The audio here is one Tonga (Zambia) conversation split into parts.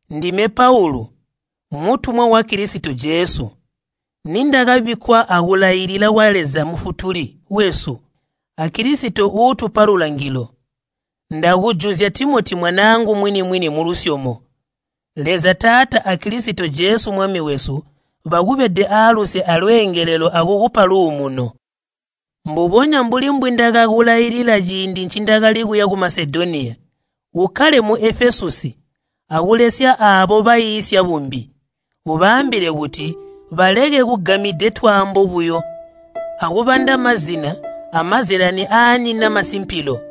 Ndime Paulu, mutumwa wa Kilisito Jesu, nindakabikkwa akulailila kwa Leza Mufutuli wesu, a Kilisito uutupa lulangilo. Ndakujuzya Timoti mwanaangu mwini-mwini mulusyomo. Leza Taata a Kilisito Jesu Mwami wesu bakubede aaluse alweengelelo akukupa luumuno. Mbubonya mbuli mbwindakakulailila ciindi ncindakali kuya ku Masedoniya, ukkale mu Efesusi akulesya aabo baiisya bumbi. Ubaambile kuti baleke kugamide twaano buyo akubanda mazina amazyalani aanyina masimpilo.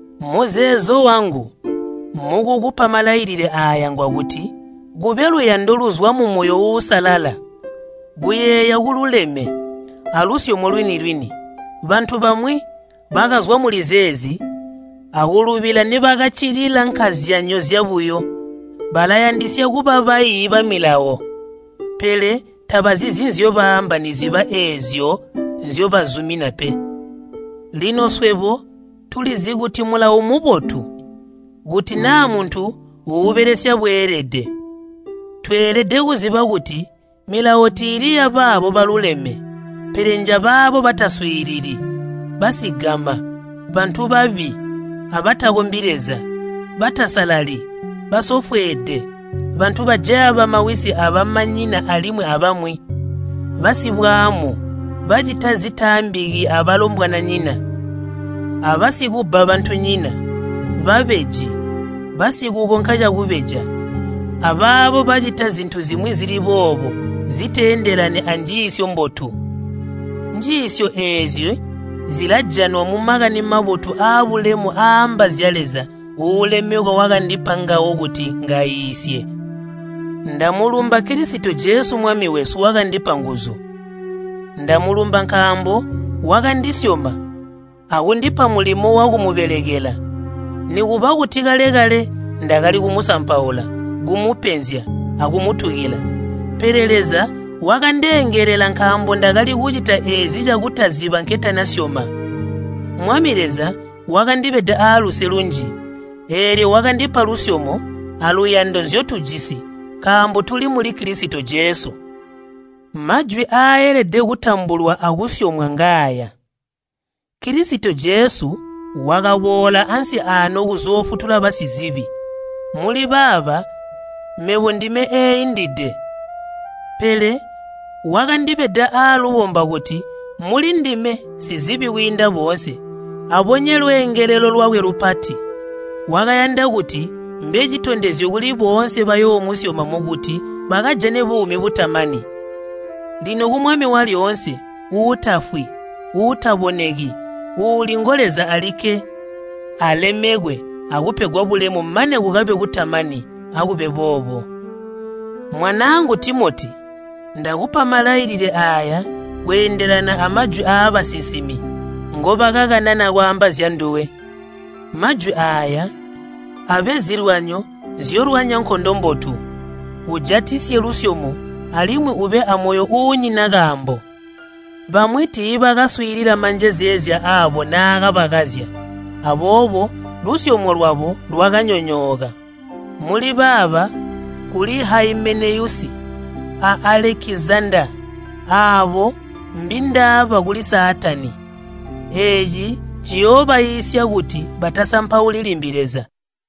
Muzeezo wangu mukukupa malalilile aaya ngwakuti kube luyando luzwa mumoyo uusalala, kuyeeya kululeme, alusyomo lwini-lwini. Bantu bamwi bakazwa muli zeezi akulubila nibakaccilila nkazyanyo zyabuyo. Balayandisya kuba baiyi bamilawo, pele tabazizi nzyobaamba niziba eezyo nzyobazumina pe. Lino swebo tulizi kuti Mulawo mmubotu kuti naa muntu uubelesya bweelede. Tweelede kuziba kuti milawo tiili yabaabo baluleme, pele njabaabo bataswiilili, basigama, bantu babi abatakombi Leza, batasalali, basofweede, bantu bajaya bamawisi abamanyina alimwi abamwi, basibwaamu bacita zitaambiki abalombwananyina, abasikubba bantunyina, babeji, basikukonka cakubeja, abaabo bacita zintu zimwi zili boobo ziteendelani anjiisyo mbotu. Njiisyo eezi zilajanwa mu Makani Mabotu aabulemu aaamba zya Leza uulemekwa wakandipa ngawo kuti ngaiisye. Ndamulumba Kilisito Jesu Mwami wesu wakandipa nguzu. Ndamulumba nkaambo wakandisyoma akundipa mulimo wakumubelekela, nikuba kuti kale-kale ndakali kumusampaula, kumupenzya, akumutukila. Pele Leza wakandeengelela nkaambo ndakali kucita eezi cakutaziba nketanasyoma. Mwami Leza wakandibeda aaluse lunji, eelyo wakandipa lusyomo aluyando nzyotujisi nkaambo tuli muli Kilisito Jesu. Majwi aaelede kutambulwa akusyomwa ngaaya, “Kilisito Jesu wakaboola ansi aano kuzoofutula basizibi.” Muli baaba mebo ndime eeindide. Pele wakandibeda aalubomba kuti mulindime sizibi kwiinda boonse, abonye lweengelelo lwakwe lupati. Wakayanda kuti mbe citondezyo kuli boonse bayoomusyoma mukuti bakajane buumi butamani. Lino ku Mwami walyoonse, uutafwi, uutaboneki, uuli ngo Leza alikke, alemekwe akupegwa bulemu mane kukabe kutamani. Akube boobo. Mwanaangu Timoti, ndakupa malailile aaya kweendelana amajwi abasinsimi ngobakakanana kwaamba zyanduwe. Majwi aaya abe zilwanyo nzyolwanya nkondo mbotu. Ujatisye lusyomo alimwi ube amoyo uunyina kaambo. Bamwi tiibakaswiilila manjezeezya aabo naakabakazya, aboobo lusyomo lwabo lwakanyonyooka. Muli baaba kuli Haimeneyusi a Alekizandaa aabo mbindaaba kuli Saatani. Eeci ciyoobaiisya kuti batasampauli limbi Leza.